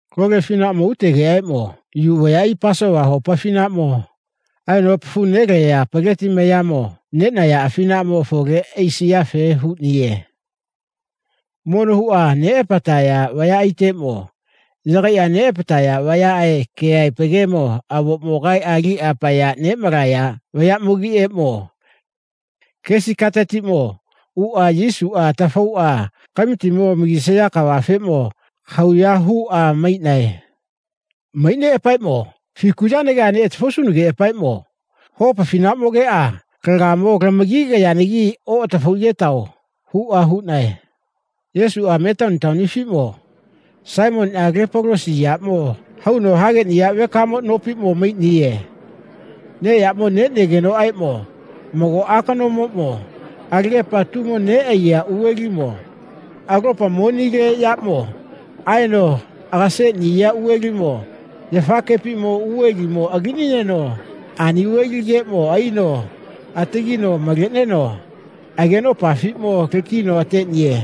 Lole afinaʼmo utesigenoʼaeʼmo Yu vayaʼai Pasova hopa afinaʼmo aeno apafu noleya peleti mayamo neʼnaya afinaʼmo afole aisiyafe huʼniye. Mono huʼa neʼapataya vayaʼaiteʼmo yagaiʼa neʼapataya vayaʼe keʼaepa gemo avoʼmo kaeʼa aliʼa apaya neʼmalaya vayaʼmogiʼeʼmo kesi katetiʼmo uʼa Yesuʼa atafauʼa kamitimo amagisaya kafeʼmo kahauya huʼa maiʼnae. Maiʼneʼapaeʼmo, fiku yanageʼa neʼatafausunageʼapaeʼmo hopa afinaʼmogeʼa lagaemo lamagigayanagi oʼatafaigetao, huʼa huʼnae. Yesuʼa Metani taonifiʼmo Saimoniʼa lepolosi yaʼmo hauno hageʼniya vekamo nopiʼmo maiʼniye. Neʼyaʼmo neʼnegenoʼaeʼmo mago akanomoʼmo alagepa atumo neʼaiya uvelimo alopa monileʼyaʼmo aeno agaseʼniya uvelimo yafa kepi uvelimo alinineno ani uveli keʼmo aino atagi maleʼneno agenopafiʼmo lakino ateʼniye.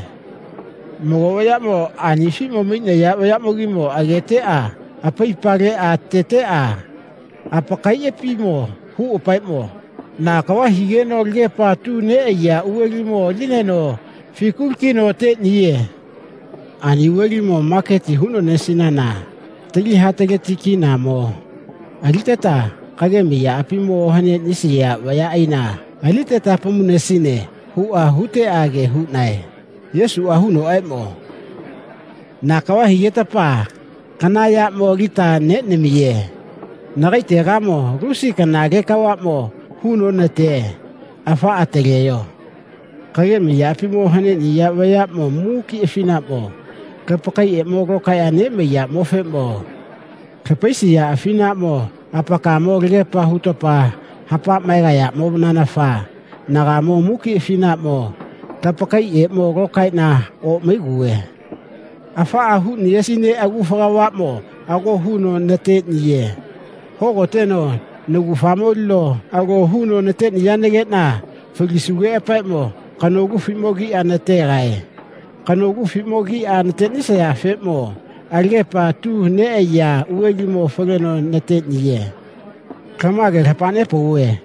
Mago vayaʼmo anifi maiʼnaya vayaʼmogimo ageteʼa apaipa leʼa ateteʼa apakaiʼapimo huʼapaeʼmo, na kava higeno alagepa atu neʼaiya uvelimo alinineno fiku lakino ateʼniye. Ani uvelimo maketi huʼnonesinana tali hataleti kinamo aliteta kagemi yaʼapimo ohaneʼnisiya vayaʼaina aliniteta apamunesine, huʼa huteʼa ge hauʼnae. Yesuʼa hunoʼaeʼmo, na kava higetapa kana yaʼmo alita neʼamiye. Nagaetegamo lusi kanale kavaʼmo huno neʼnate. Afaʼa ataleyo. Kagemi yaʼapimo ohaneʼniya vayaʼmo muki afinaʼmo lapakaeʼeʼmo lokaeʼa neʼmaiyaʼmofeʼmo lapaisiya afinaʼmo apakaemo alagepa hutapa hapa maegayaʼmonanafa nagaemo muki afinaʼmo lapakaeʼeʼmo lokaeʼna oʼmaiguve. Afaʼa huʼniyesina agufa kavaʼmo ago huno nateʼniye. Hogoteno nagufamo alino alo huno nateʼniyanageʼna falisugeʼapaeʼmo kanolufiʼmo kiʼa nategae. Kanolufiʼmo kiʼa natesayafeʼmo alagepa atu neʼaiya uvelimo faleno nateʼniye. Lama gemo lapa nepauve,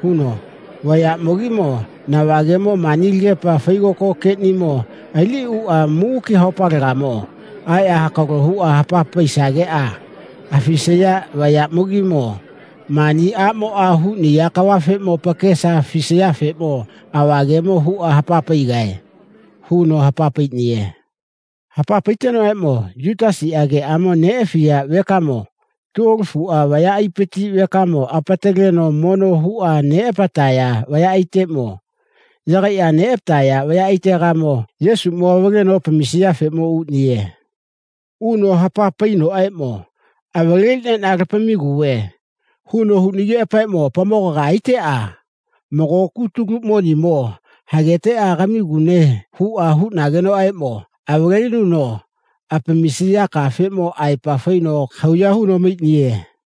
huno, vayaʼmogimo nava gemo mani alagepa faigoko geʼnimo aliʼniʼuʼa muki haopalegamo aeʼa hakalo huʼa hapa paisageʼa afisaya vayaʼmogimo mani aʼmoʼa huʼniya kavafeʼmo apakesa afisayafeʼmo ava gemo huʼa hapa paigae, huno hapa paiʼniye. Hapa paitegenoʼaeʼmo Yutasiʼa geʼamo neʼafiya vekamo tuolofuʼa vayapati vekamo apataleno mono huʼa neʼapataya vayaʼaiteʼmo yagaiʼa apateʼnaya vayaʼaitegamo Yesuʼmo avaleno apamisiyafeʼmo uʼniye. Uno hapa painoʼaeʼmo, avaleliʼneʼna lapamiguve, huno huʼnigeʼapaeʼmo apamogaga aiteʼa, mago kutulu monimo hageta kamigune, huʼa huʼnagenoʼaeʼmo avalelinuno apamisiya kafeʼmo aepa faino kahauya huno maiʼniye.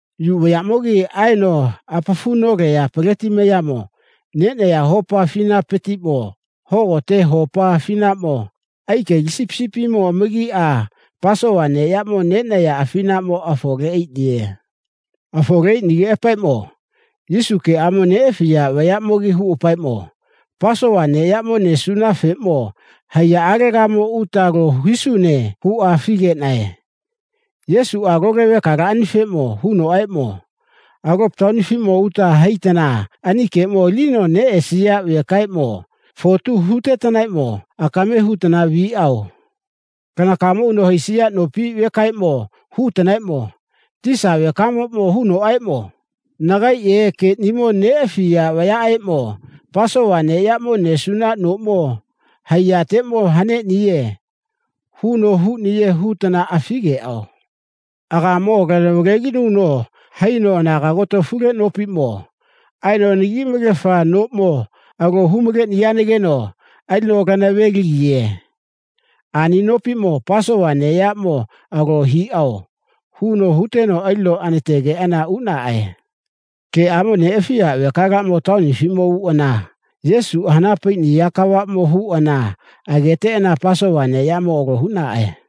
Yu vayaʼmogi aeno apafu noleya peleti mayamo neʼnaya hopa afinapatiʼmo hogote hopa afinaʼmo aikeli sipisipimo apamagiʼa Pasova neʼyaʼmo neʼnaya afinaʼmo afole aiʼniye. Afole aiʼnigeʼapaeʼmo Yesu geʼamo neʼafiya vayaʼmogi huʼapaeʼmo, Pasova neʼyaʼmo nesunafeʼmo haiyaʼalegamo uta alo hisune, huʼa afi geʼnae, Yesuʼa lole vekalaʼanifeʼmo hunoʼaeʼmo, alopa taonifiʼmo uta haitana ani keʼmo alinino neʼesiya vekaʼeʼmo fotu hutetanaeʼmo akame hutana viʼao. Lanakaemo uno haisiya nopi vekaeʼmo hutanaeʼmo, Tisa vekamoʼmo hunoʼaeʼmo, nagaeʼe geʼnimo neʼafiya vayaʼeʼmo Pasova neʼyaʼmo nesuna noʼmo haiyateʼmo haneʼniye, huno huʼniye, hutana afi geʼao. Agaemo lana valelinuno haino anaga agotofule nopiʼmo aeno anagi malefa noʼmo alo hu maleʼniyanageno alino lana veligiye. Ani nopiʼmo Pasova neʼyaʼmo alo hiʼao, huno huteno alino anategeʼana uʼnaʼae. Geʼamo neʼafiʼa vekalaʼmo taonifiʼmo uʼana Yesuʼa hana paiʼniya kavaʼmo huʼana ageteʼana Pasova neʼyaʼmo alo huʼnaʼae.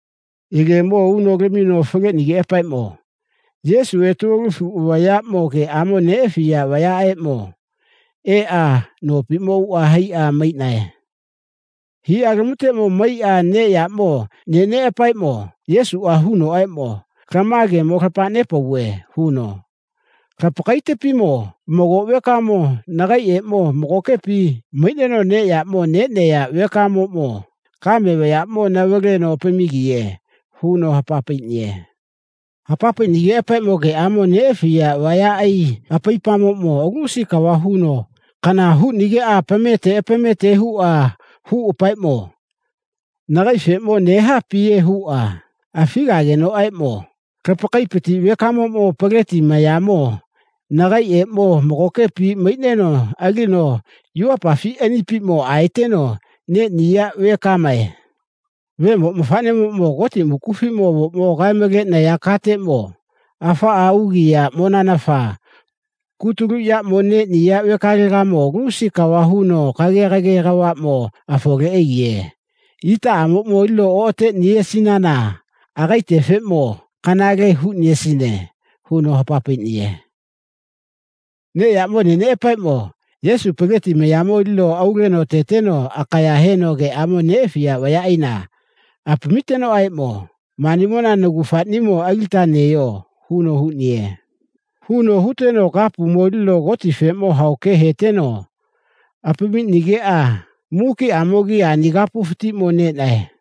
Yegemo uno lamino faleʼnigeʼapaeʼmo Yesuʼe tuolofuʼa vayaʼmo geʼamo neʼafiya vayaʼeʼmo eʼa nopiʼmo uʼa haiʼa maiʼnae. Hiʼyalamuteʼmo maiʼneʼa neʼyaʼmo neʼneʼapaeʼmo Yesuʼa hunoʼaeʼmo, lama gemo lapa nepauve, huno, lapakaepatiʼmo mago vekamo nagaeʼeʼmo magokepi maiʼneno neʼyaʼmo neʼneya vekamoʼmo kame vayaʼmo navaleno apamigiye, huno hapa paiʼniye. Hapa paiʼnigeʼapaeʼmo geʼamo neʼafiya vayaʼai apaipamoʼmo lusi kava huno kana huʼnigeʼa apamete apamete huʼa huʼapaeʼmo, nagaefeʼmo nehapiye, huʼa afi geʼnagenoʼaeʼmo, Lapakaepati vekamoʼmo peleti mayamo nagaeʼeʼmo magokepi maiʼneno alino yuvapafi anipiʼmo aeteno neʼniya vekamae. Vemo mafaʼnemoʼmo Goti mukufiʼmo avoʼmo kae maleʼnaya kateʼmo afaʼa ugiyaʼmonanafa kutulu yaʼmo neʼniya vekalegamo lusi kava huno kage kage kavaʼmo afole aigiye. Itaʼamoʼmo alino oʼateʼniyesinana agaetefeʼmo kanale huʼniyesine, huno hapa paiʼniye. Neʼyaʼmo neʼneʼapaeʼmo Yesuʼa peleti mayamo alino auleno ateteno akaya heno geʼamo neʼafiya vayaʼaina apamitenoʼaeʼmo, manimona nagufaʼnimogi alita neyo, huno huʼniye. Huno huteno kapumo alino Gotifeʼmo hao ke heteno apamiʼnigeʼa mukiʼamogimo ani kapufatiʼmo neʼnae.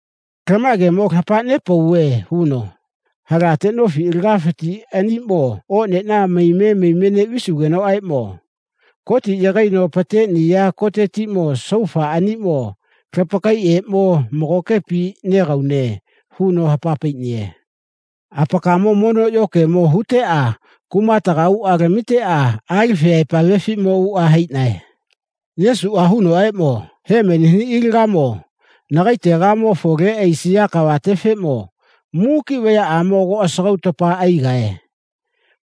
Lama gemo lapa nepauve, huno, halate nofi alagafati aniʼmo oʼneʼna maime maime neʼvisugenoʼaeʼmo Gotiʼa yagaino apateʼniya kotetiʼmo saufa aniʼmo lapakaeʼeʼmo magokepi negaune, huno hapa paiʼniye. Apakaemo mono yokemo huteʼa kumatega uʼa lamiteʼa Alifiʼaepa avefiʼmo uʼa haiʼnae. Yesuʼa hunoʼaeʼmo, Hemeni haniʼilagamo nagaetegamo afole aisiya kavatefeʼmo muki vayaʼamo ago asagautapa aigae.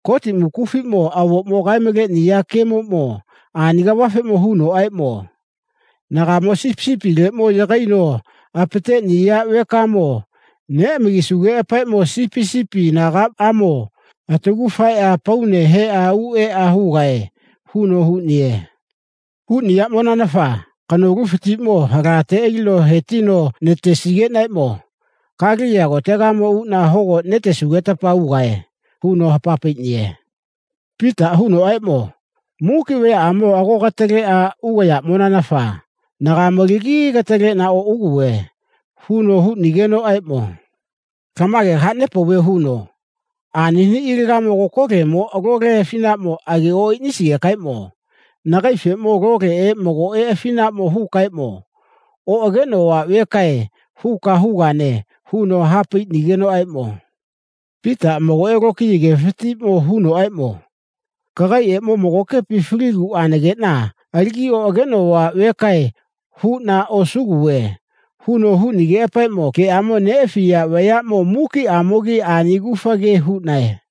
Goti Mukufiʼmo avoʼmo kae maleʼniya gemoʼmo ani kavafeʼmo hunoʼaeʼmo, Nagaemo sipisipileʼmo yagaino apateʼniya vekamo neʼamagisugeʼapaeʼmo sipisipi anagaʼamo atagu faeʼa apaune heʼa u eʼa hugae, huno huʼniye. Huʼniyaʼmonanafa kanolufatiʼmo halate alino he tino natesigeʼnaeʼmo Galeliya kotegamo uʼna hogo netesugetapa ugae, huno hapa paiʼniye. Pitaʼa hunoʼaeʼmo, muki vayaʼamo ago kataleʼa ugayaʼmonanafa nagaemo alagi kataleʼna oʼuguve, huno huʼnigenoʼaeʼmo, lama gemo kaha nepauve, huno, ani haniʼilagamo kokolemoʼmo lole afinaʼmo age oʼaiʼnisigekaeʼmo nagaefeʼmo loleʼe magoʼe afinaʼmo hukaeʼmo, oʼageʼnova vekae, huka hugane, huno ha paiʼnigenoʼaeʼmo Pitaʼa magoʼe huno lokiya gefatiʼmo hunoʼaeʼmo, kagaeʼeʼmo magokepi faliguʼanageʼna alagi oʼageʼnova vekae, huʼna osuguve, huno huʼnigeʼapaeʼmo geʼamo neʼafiya vayaʼmo mukiʼamogimo ani agufa ge huʼnae.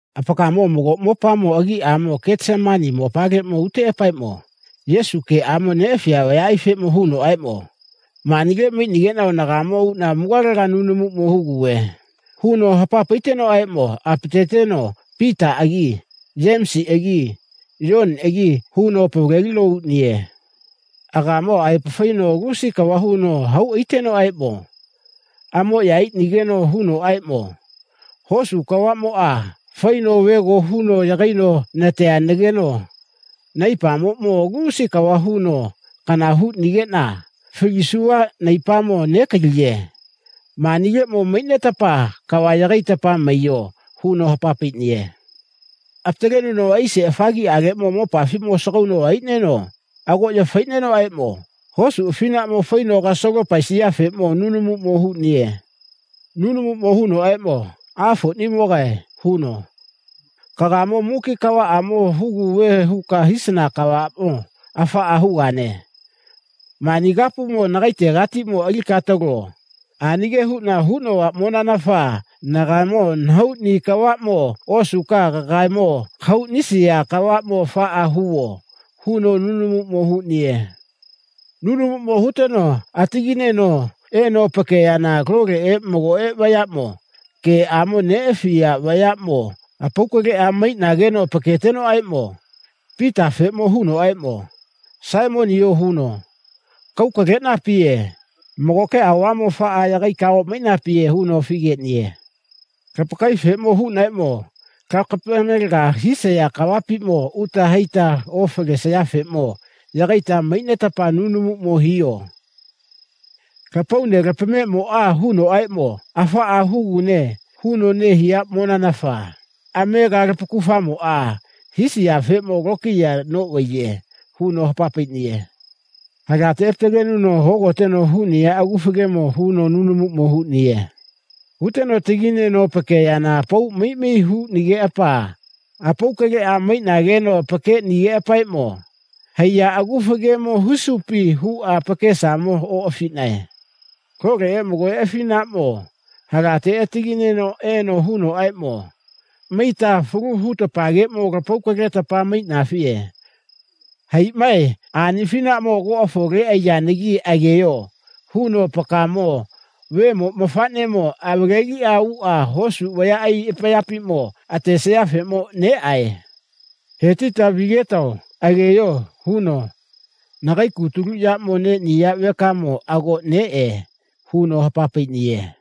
Apakaemo mago mopamo agiʼamo Getesemani mopaleʼmo uteʼapaeʼmo Yesuʼa geʼamo neʼafiya vayaʼaifeʼmo hunoʼaeʼmo, manile maiʼnigeʼnao nagaemo uʼna mugalega nunumuʼmo huguve, huno hapa paitenoʼaeʼmo apateteno Pitaʼagi Yemisiʼagi Yoniʼagi huno apavalelino uʼniye. Agaemo aepa faino lusi kava huno hau aitenoʼaeʼmo amoʼya aiʼnigeno hunoʼaeʼmo, hosu kavaʼmoʼa faino vego huno yagaino neʼnategeno naipamoʼmo lusi kava huno kana huʼnigeʼna falisuva naipamo nekaliye. Manileʼmo maiʼnetapa kava yagaita maiyo, huno hapa paiʼniye. Apatalenuno aise afagiʼaleʼmo mopafiʼmo asagauno aino agoʼya faiʼnenoʼaeʼmo hosu afinaʼmo faino kasalo paesiyafeʼmo nunumuʼmo huʼniye. Nunumuʼmo hunoʼaeʼmo, Afoʼnimogae, huno, kagaemo muki kavaʼamo huguve huka hisana kavaʼmo afaʼa hugane. Mani kapumo nagaetegatiʼmo alika atalo. Ani ge huʼna huvaʼmonanafa nagaemo nahauʼni kavaʼmo osuka kagaemo kahauʼnisiya kavaʼmo afaʼa huvo, huno nunumuʼmo huʼniye. Nunumuʼmo huteno atagineno eno apakeyana loleʼe magoʼe vayaʼmo geʼamo neʼafiya vayaʼmo apau kaleʼa maiʼnageno apaketenoʼaeʼmo Pitafeʼmo hunoʼaeʼmo, Saimoniyo, huno, kau kaleʼnapiye. Magoke aovamo afaʼa yagaika oʼmaiʼnapiye, huno afi geʼniye. Apakaefeʼmo hunoʼaeʼmo, lapamalageka hisiya kavapiʼmo uta haita ofalesayafeʼmo yagaita maiʼnetapa nunumuʼmo hiyo. Lapaunelapameʼmoʼa hunoʼaeʼmo, afaʼa hugune, huno nehiyaʼmonanafa amega lapakufamoʼa hisayafeʼmo lokiya noʼvaiye, huno hapa paiʼniye. Halate apatalenuno hogoteno huʼniya agufa gemo huno nunumuʼmo huʼniye. Huteno atagi neneno apakeyana apau mai mai huʼnigeʼapa apau kaleʼa maiʼnageno apakeʼnigeʼapaeʼmo, haiya agufa gemo husupi, huʼa apakesamo oʼafiʼnae. Loleʼe magoʼe afinaʼmo halate atagineno eno hunoʼaeʼmo, maita falu hutapageʼmo lapau kaletapa maiʼnafiye. Haiʼmae. Ani afinaʼmo ago afole aiyanagi ageyo, huno, apakaemo Vemo Ma faʼnemo avaleliʼuʼa hosu vayaʼai apayapiʼmo atesayafeʼmo neʼae. He tita vigetao. Ageyo, huno, nagae kutulu yaʼmo neʼniya vekamo ago neʼe, huno hapa paiʼniye.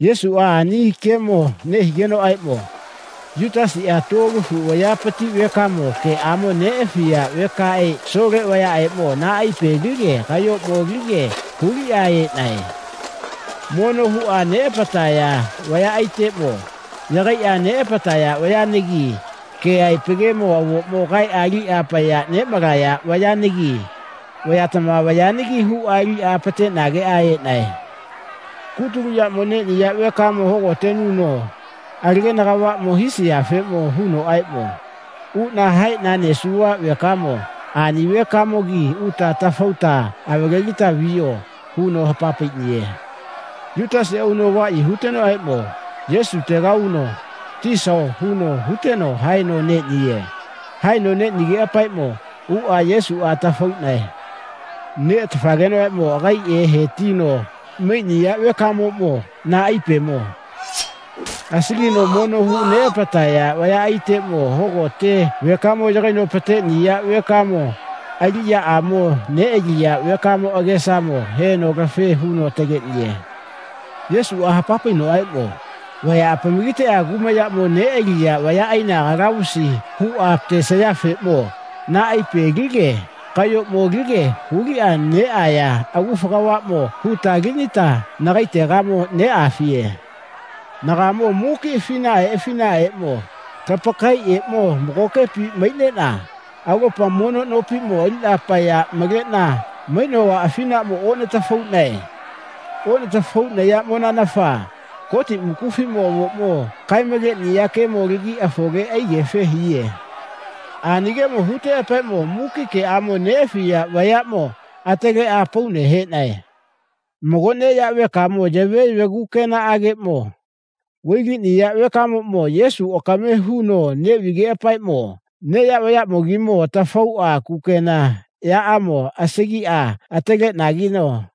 Yesuʼa ani gemo nehigenoʼaeʼmo Yutasiʼmo tuolofuʼa vayapati vekamo geʼamo neʼafiya vekaʼe asole vayaʼeʼmo naipe alige kayoʼmo alige huliʼa eʼnae. Mono huʼa neʼapataya vayaʼaiteʼmo yagaiʼa apateʼnaya vayanagi keʼaepa gemo avoʼmo kaeʼa aliʼa apaya neʼmalaya vayanagi vayatama vayanagi huʼa aliʼa apateʼnageʼa eʼnae. Kutulu yaʼmo neʼniya vekamo hogotenuno alagena kavaʼmo hisiyafeʼmo hunoʼaeʼmo, uʼna haeʼna nesuva vekamo ani vekamogi uta atafauta avalelita viyo, huno hapa paiʼniye. Yutasiʼa uno avaʼyi hutenoʼaeʼmo Yesutega uno, Tisao, huno huteno haeno neʼniye. Haeno neʼnigeʼapaeʼmo uʼa Yesuʼa atafauʼnae. Neʼatafagenoʼaeʼmo agaeʼe he tino maiʼniya vekamoʼmo naipemo asagino mono huʼa neʼapataya vayaʼaiteʼmo hogote vekamo yagaino apateʼniya vekamo aliʼyaʼamo neʼaliya vekamo agesamo heno lafe huno ataleʼniye. Yesuʼa hapa painoʼaeʼmo, vaya apamagiteʼa kumayaʼmo neʼaliya vayaʼaina kalavusi huʼa apatesayafeʼmo naipe alige kayoʼmo alige huliʼa neʼaya agufa kavaʼmo huta alinita nagaetegamo neʼafiye. Nagaemo muki afinaʼae afinaʼaeʼmo lapakaeʼeʼmo magokepi maiʼneʼna alopa mono nopiʼmo aliʼna apaya maleʼna maiʼnova afinaʼmo oʼnatafauʼnae. Oʼnatafauʼnayaʼmonanafa Goti Mukufiʼmo avoʼmo kae maleʼnaya gemo alagi afole aigefe hiye. Ani gemo hutegeʼapaeʼmo muki geʼamo neʼafiya vayaʼmo ataleʼa apaune heʼnae. Mago neya vekamoʼmo yave yave kukenaʼageʼmo vailiʼniya vekamoʼmo Yesuʼa akame huno neʼvigeʼapaeʼmo neya vayaʼmogimo atafauʼa kukena yaʼamo asagiʼa alitageno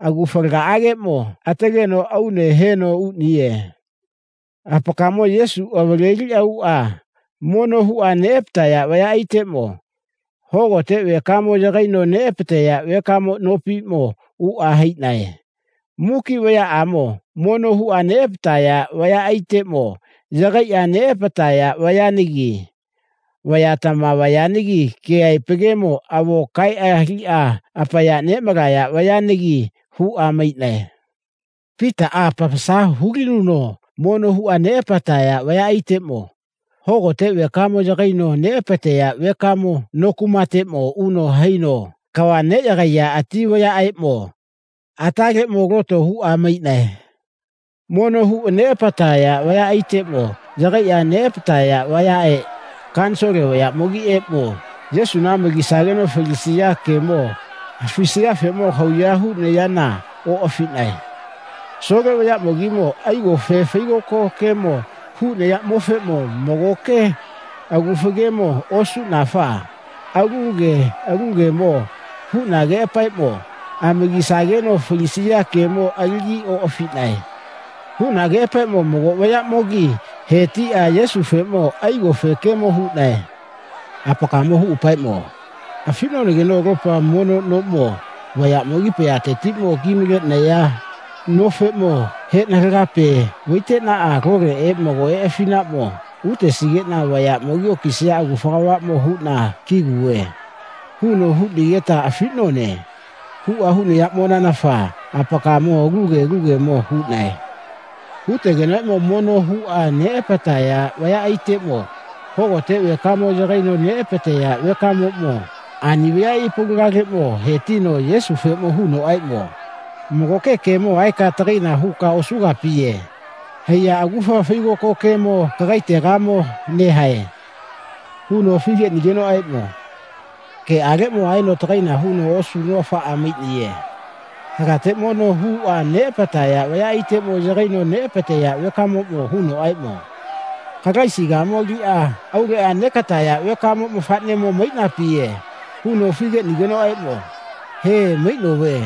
agufalagaʼagekeʼmo ataleno aune heno uʼniye. Apakaemo Yesuʼa avaleliʼuʼa mono huʼa neʼapataya vayaʼaiteʼmo hogote vekamo yagaino neʼapateya vekamo nopiʼmo uʼa haiʼnae. Muki vayaʼamo mono huʼa neʼapataya vayaʼaiteʼmo yagaiʼa neʼapataya vayanagi vayatama vayanagi keʼaepa gemo avoʼmo kaeʼa aliʼa apaya neʼmalaya vayaʼnagi huʼa maiʼnae. Pitaʼa apamasa hulinuno mono huʼa neʼapataya vayaʼaiteʼmo hogote vekamo yagaino neʼapateya vekamo no kumateʼmo uno haino kava neʼyagaiya ati vayaʼeʼmo ataleʼmo loto huʼa maiʼnae. Mono huʼa neʼapataya vayaʼaiteʼmo yagaiʼa neʼapataya vayaʼe kanisole vayaʼmogiʼeʼmo Yesuna amagisageno falisiya gemo afisayafeʼmo kahauya huʼnayana oʼafiʼnae. Asole vayaʼmogimo aigofe faigoko gemo huʼnayaʼmofeʼmo magoke agufa gemo osuʼnafa alu ge alu gemo huʼnageʼapaeʼmo amagisageno falisiya gemo alagi oʼafiʼnae. Huʼnageʼapaeʼmo mago vayaʼamogi he tiʼa Yesufeʼmo aigofe gemo huʼnae. Apakaemo huʼapaeʼmo, afiʼnonageno alopa mono noʼmo vayaʼmogi apayatetiʼmo ki maleʼnaya nofeʼmo heʼna halagape vaiteʼna loleʼe magoʼe afinaʼmo utesigeʼna vayaʼmogi okisaya agufa kavaʼmo huʼna kiguve, huno huʼnigeta afiʼnone, huʼa huʼnayaʼmonanafa apakaemo alu ge alu gemo huʼnae. Hutagenoʼaeʼmo mono huʼa neʼapataya vayaʼaiteʼmo hogote vekamo yagaino neʼapateya vekamoʼmo ani vayaʼai apaulagaleʼmo he tino Yesufeʼmo hunoʼaeʼmo, magoke gemo aeka atagaina huka osugapiye. Haiya agufa faigoko gemo kagaetegamo nehae, huno afi geʼnigenoʼaeʼmo geʼaleʼmo aeno atagaina huno osuno afaʼa maiʼniye. Halate mono huʼa neʼapataya vayaʼaiteʼmo yagaino neʼapateya vekamoʼmo hunoʼaeʼmo, Kalaisigamo aliʼa auleʼa neʼataya vekamo mafaʼneʼamo maiʼnapiye, huno afi geʼnigenoʼaeʼmo he, maiʼnove.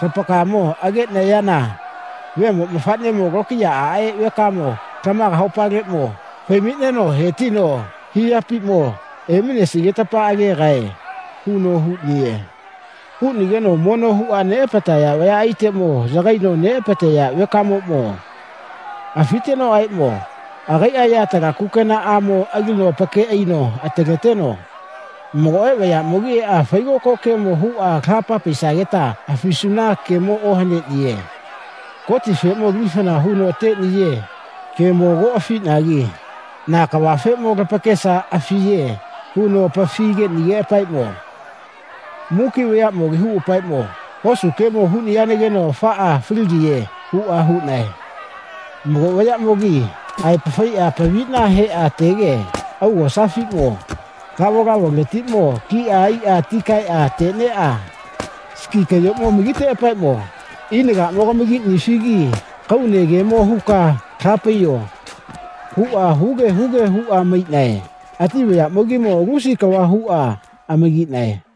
Lapakaemo agegayana Vemo Mafaʼnemo Lokiyaʼaʼe Vekamo lamaga haopaleʼmo fai maiʼneno he tino hiyapiʼmo eminesigetapa agegae, huno huʼniye. Huʼnigeno mono huʼa neʼapataya vayaʼaiteʼmo yagaino neʼapateya vekamoʼmo afitenoʼaeʼmo agaiʼa yatala kukenaʼamo alino apake aino ataleteno, magoʼe vayaʼmogi eʼa faigoko gemo huʼa laha paisageta afisuna gemo ohane. Gotifeʼmo lifana huno ateʼniya gemo ago afiʼnagi na kavafeʼmo lapakesa afiye, huno apafi geʼnigeʼapaeʼmo muki vayaʼmogi huʼapaeʼmo, hosu gemo huʼniyanageno afaʼa faligiye, huʼa huʼnae. Mago vayaʼamogi aepa faiʼa apaviʼna heʼa atege augosafiʼmo lavolavoletiʼmo kiʼa aiʼa atikaeʼa ateʼneʼa siki kayoʼmo amagiteʼapaeʼmo, ina laʼmo kamagiʼnifigi kaune gemo huka laha paiyo, huʼa huge huge huʼa maiʼnae. Ati vayaʼmogimo lusi kava huʼa amagiʼnae.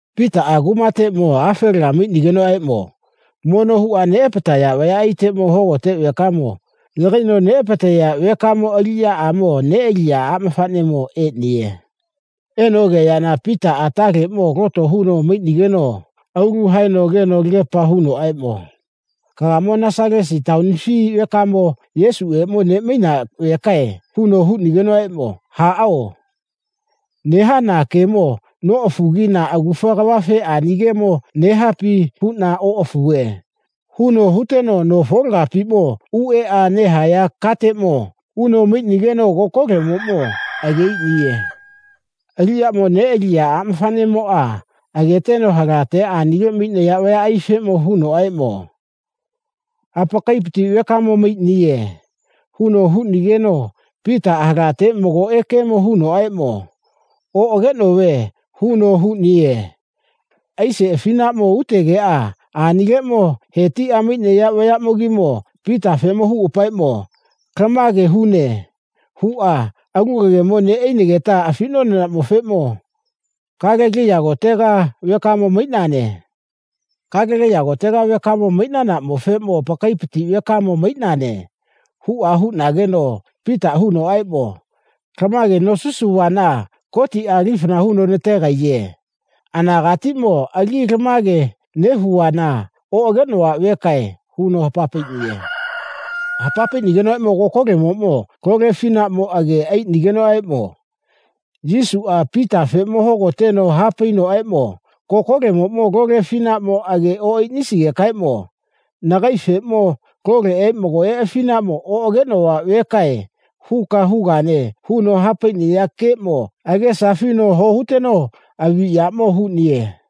Pitaʼa kumateʼmo afelaga maiʼnigenoʼaeʼmo mono huʼa neʼapataya vayaʼaiteʼmo hogote vekamo yagaino neʼapateya vekamo aliʼyaʼamo neʼaliya aʼmafaʼnemo eʼniye. Eno ageyana Pitaʼa ataleʼmo loto huno maiʼnigeno aulu haeno ageno alagepa huʼnenoʼaeʼmo, kagaemo Nasalasa taonifi vekamo Yesuʼeʼmo neʼmaina vekae, huno huʼnigenoʼaeʼmo haʼao, nehana gemo noʼafugi na agufa kavafe ani gemo nehapi huʼna oʼafuve, huno huteno no folagapiʼmo uʼeʼa nehaya kateʼmo uno maiʼnigeno kokolemoʼmo age aiʼniye. Aliʼyaʼmo neʼaliya aʼmafaʼnemoʼa ageteno halate anile maiʼnaya vayaʼaifeʼmo hunoʼaeʼmo, apakaepati vekamo maiʼniye, huno huʼnigeno Pitaʼa halate magoʼe gemo hunoʼaeʼmo, oʼageʼnove, huno huʼniye. Aise afinaʼmo utegeʼa anileʼmo he tiʼa maiʼnaya vayaʼmogimo Pitafeʼmo huʼapaeʼmo, lama gemo hune, huʼa, alu kagemo neʼainageta afiʼnonaʼmofeʼmo Galeliya kotega vekamo maiʼnane. Galeliya kotega vekamo maiʼnanaʼmofeʼmo apakaepati vekamo maiʼnane, huʼa huʼnageno Pitaʼa hunoʼaeʼmo, lama ge nosisuvana Gotiʼa lifana huno nategaiye. Anagatiʼmo alagi lama ge nehuvana oʼageʼnova vekae, huno hapa paiʼniye. Hapa nepaigenoʼaeʼmo kokolemoʼmo lole afinaʼmo age aiʼnigenoʼaeʼmo Yesuʼa Pitafeʼmo hogoteno ha painoʼaeʼmo kokolemoʼmo lole afinaʼmo age oʼaiʼnisigekaeʼmo nagaefeʼmo loleʼe magoʼe afinaʼmo oʼageʼnova vekae, huka hugane, huno ha paiʼniya geeʼmo agesa afino ho huteno aviʼyaʼmo huʼniye.